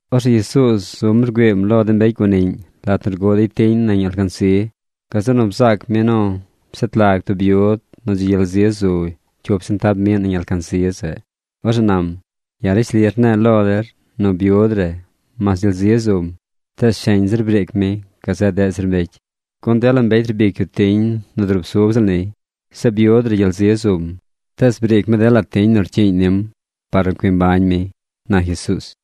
Orzeꞌ Jesuuz zum rgüiim lo de mbecy guaniꞌñ lat nu rguꞌ dey tiñ gun nañ alcansi. Gazeꞌ nu bzaac mi nu pshet lag tub byud nu dzi gyel zi zu cyup sentab miꞌ nañ alcansi zeꞌ. Orzeꞌ nam: ―Ya̱ rishli rne̱e̱ lo der nu byud re mas gyel zi zum, tees sheñ zir briic mi gazeꞌ deꞌ zir mbecy. Gun dela mbecy rbic yu tiñ nu drusub ziꞌl niy. Zeꞌ byud re gyel zi zum. Tees briic mi dela tiñ nu rcyiiñ nim par nu cui mbañ mi ―na Jesuuz.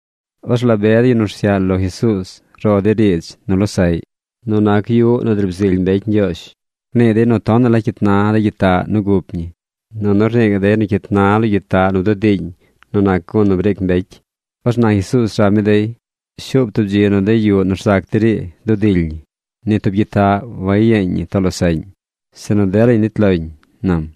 Orzeꞌ la be de yu nu rsyaꞌ lo Jesuuz ro dey riidz nu losaꞌy nu nac yuꞌ nu driib zily mbecy Ñgyoozh. Rnii dey nu tonaꞌ la cyit na de gyitaꞌ nu gup ñi, nunu rnii gaꞌ dey nu cyit na lo gyitaꞌ nu bdudii nu gun nu briic mbecy. Orzeꞌ na Jesuuz rab mi dey: ―Shuub tub dzi nu de yuꞌ nu rzac der ii dudily ñi. Ni tub gyitaꞌ wayeñ ñi too losaꞌñ, sinu delañ nit loñ ―nam.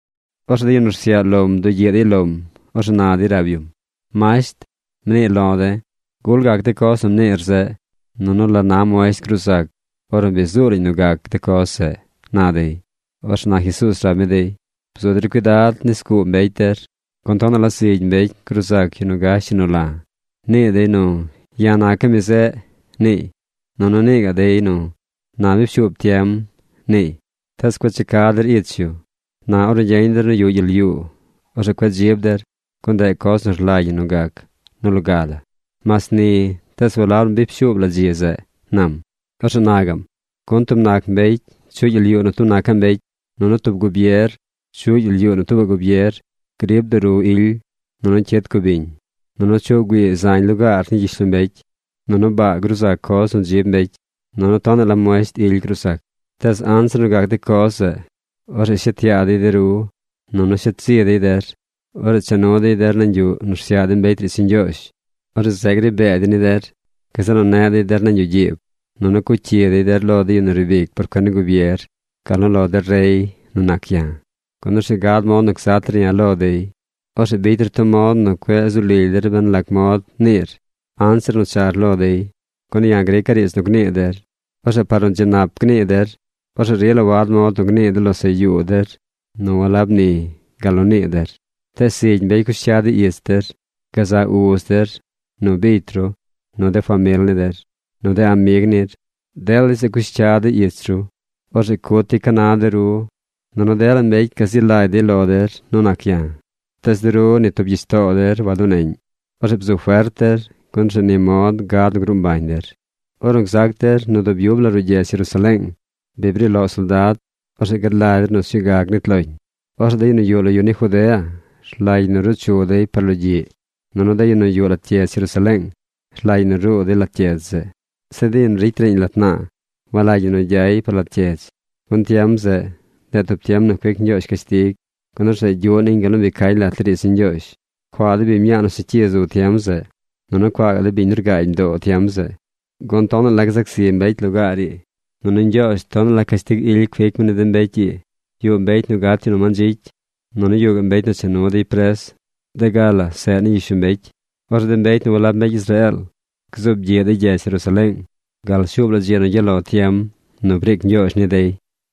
Orzeꞌ de yu nu rsyaꞌ lom bdugyiꞌ dey lom. Orzeꞌ na dey rab yum: ―Masht, mnii lo̱ de̱. ¿Gul gac de coz nu mniir zeꞌ? Nunu ¿la na muesht gruu zac ornu bi zuu lañ nu gac de coz zeꞌ? ―na dey. Orzeꞌ na Jesuuz rab mi dey: ―Bzu der cuidad nis guu mbecy der, gun tonaꞌ la zigy mbecy gruu zac yu nu gash yu nu la̱. Nii dey nu “Ya̱ naca̱ mi zeꞌ”, niiy. Nunu nii gaꞌ dey nu “Na bi pshuub tiem”, niiy. Tees cueꞌ cha ca der ich yu. Na ornu gyeñ der nu yuꞌ gyel yuu, orzeꞌ cueꞌ dzib der, gun ndeꞌ coz nu rlagy ñi nu gac nu loga la. Mas ni, tees walab nu bi pshuub la dzi zeꞌ ―nam. Orzeꞌ na gaꞌm: ―Gun tub nac mbecy chuꞌy gyel yuu nu tub nacaꞌ mbecy. Nunu tub gubier chuꞌy gyel yuu nu tuubaꞌ gubier. Grib duru ily. Nunu cyid cubiñ. Nunu chuꞌ güii zañ lugaar ni gyishlombecy. Nunu baa gruu zac coz nu dzib mbecy. Nunu tonaꞌ la muesht ily gruu zac. ’Tees anzir nu gac de coz zeꞌ, orzeꞌ shet yaa dey de ru. Nunu shet zi dey der. Orzeꞌ cha nu dey der nañ yuꞌ nu rsyaꞌ de mbecy riidz ni Ñgyoozh. Orzeꞌ zeꞌ gri bee dey ni der. Gazeꞌ nu neꞌ dey der nañ yuꞌ gyiib. Nunu cuꞌ cyi dey der lo yu nu riib ic por cuen ni gubier gal nu lo de rey nu nac ya̱. Gun orzeꞌ gad mod nu gzat der ya̱ lo dey. Orzeꞌ bicy der tub mod nu cueꞌ zu lily der ben lac mod niir anzir nu char lo dey. Gun ya̱ grica̱ riidz nu gnii der. Orzeꞌ par nu dzi nap gnii der, orzeꞌ rila wad mod nu gnii de losaꞌ yuu der nu walab ni gal nu nii der. Tees zigy mbecy cush cya dey ich der. Gazaꞌ uz der, nu bicy ru, nu de famil ni der, nu de amig nir, dela de yu zeꞌ cush cya dey ich ru. Orzeꞌ cut dey ca na de ru. Nunu dela mbecy gazi lagy dey lo der nu nac ya̱. Tees de ru ni tub gyich too der waduneꞌñ. Orzeꞌ bzu fert der, gun orzeꞌ ni mod gad nu gruu mbañ der. ’Ornu gzac der nu dub yub la ruꞌ gyedz Jerusaleeng bi bri loꞌ soldad, orzeꞌ gad lagy der nu sñuu ga gnit loñ. Orzeꞌ de yu nu yuꞌ lo yu ni Judea, rlagy ñi nu ruu chu dey par logyiꞌ. Nunu de yu nu yuꞌ lat gyedz Jerusaleeng rlagy ñi nu ruu dey lat gyedz zeꞌ. Zeꞌ de yu nu ricy riiñ lat naa walagy ñi nu gyay par lat gyedz. Gun tiem zeꞌ, ndeꞌ tub tiem nu cuic Ñgyoozh cashtig, gun orzeꞌ gyuꞌ niñ gal nu bi cañ lat de riidz ni Ñgyoozh. ¡Cuaa de biñ mñaa nu segyi zu tiem zeꞌ! Nunu, ¡cuaa gaꞌ de biñ nu rgaagy mdoo tiem zeꞌ! Gun tonaꞌ la gzac zi mbecy lugaar ii. Nunu Ñgyoozh tonaꞌ la cashtig ily cuic mi ni de mbecy ii. Yuꞌ mbecy nu gat nu mandzicy. Nunu yuꞌ gaꞌ mbecy nu cha nu dey pres de ga la zeꞌ ni gyishlombecy. Orzeꞌ de mbecy nu walab mbecy Israeel gzuub gyiꞌ dey gyedz Jerusaleeng gal shuub la dzi nu gyaꞌ lo tiem nu briic Ñgyoozh ni dey.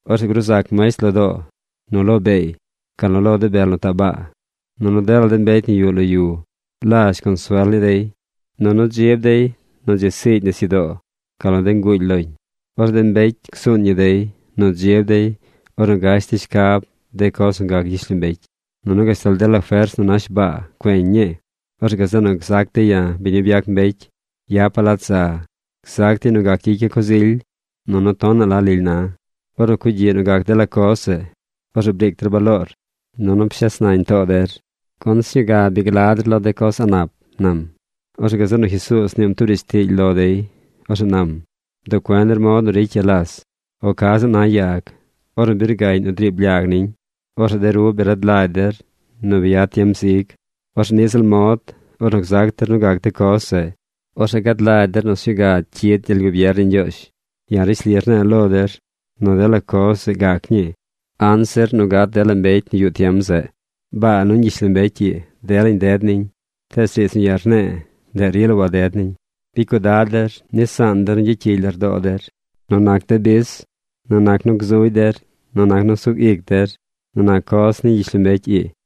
’Orzeꞌ gruu zac muesht lo doo, nu lo beey, gal nu lo de bel nu taꞌ baa. Nunu dela mbecy nu yuꞌ lo yu lazh la consuel ni dey. Nunu dzib dey nu dzi siigy nisyudoo gal nu de nguuly loñ. Orzeꞌ de mbecy csuun ñi dey nu dzib dey ornu gash dey shcab de coz nu gac gyishlombecy. Nunu gashtal dela fers nu nash baa cueñ ñii. Orzeꞌ gazeꞌ nu gzac dey ya̱ biñ nu byac mbecy yapa̱ lat za. Gzac dey nu gac gyicya̱ coz ily. Nunu tonaꞌ la lily na. Ornu cugyiꞌ nu gac dela coz zeꞌ, orzeꞌ briic der baloor, nunu pshes nañ too der, gun sñuu ga bi gla der lo de coz a̱ꞌ nap ―nam. Orzeꞌ gazeꞌ nu Jesuuz mniim tub riidz tiily lo dey. Orzeꞌ nam: ―Bduꞌ cuen der mod nu ricy ya las o ca ziꞌl na yag. Ornu bi rgaꞌñ nu driib lyag niñ, orzeꞌ de ru bi rad lagy der nu bi yad tiem zig. Orzeꞌ niꞌ ziꞌl mod, ornu gzac der nu gac de coz zeꞌ, orzeꞌ gad lagy der nu sñuu ga cyid gyel gubier ni Ñgyoozh. ’Ya̱ rishli rne̱e̱ lo der nu dela coz zeꞌ gac ñii anzir nu gat dela mbecy nu yuꞌ tiem zeꞌ. Baa nuñ gyishlombecy ii, delañ ded niñ, tees riidz nu ya̱ rne̱e̱, ndeꞌ rila waded niñ. ’Bicy cuidad der nis zaan der nu gyacyigy lardoo der nu nac de bis, nu nac nu gzugy der, nu nac nu sug ic der, nu nac coz ni gyishlombecy ii.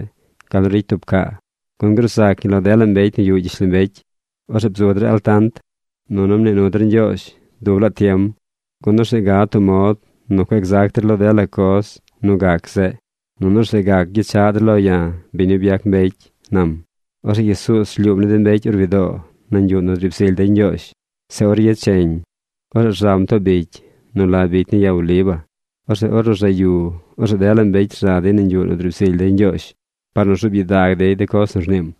gal nu ricy tub caa. Gun gruu zac ñi lo dela mbecy nu yuꞌ gyishlombecy. Orzeꞌ bzu der altant, nunu mnii nu der Ñgyoozh dub laa tiem, gun orzeꞌ gad tub mod nu cueꞌ gzac der lo dela coz nu gac zeꞌ, nunu orzeꞌ gac gyechaꞌ der lo ya̱, biñ nu byac mbecy ―nam. Orzeꞌ Jesuuz rlyuum ni de mbecy orwi doo nañ yuꞌ nu driib zily dey Ñgyoozh. Zeꞌ or yecheñ, orzeꞌ rzam too bicy nu la bicy ni Ya Oliva. Orzeꞌ ornu rzaꞌ yu, orzeꞌ dela mbecy rza dey nañ yuꞌ nu driib zily dey Ñgyoozh par nu rzuub gyidag dey de coz nu rniim.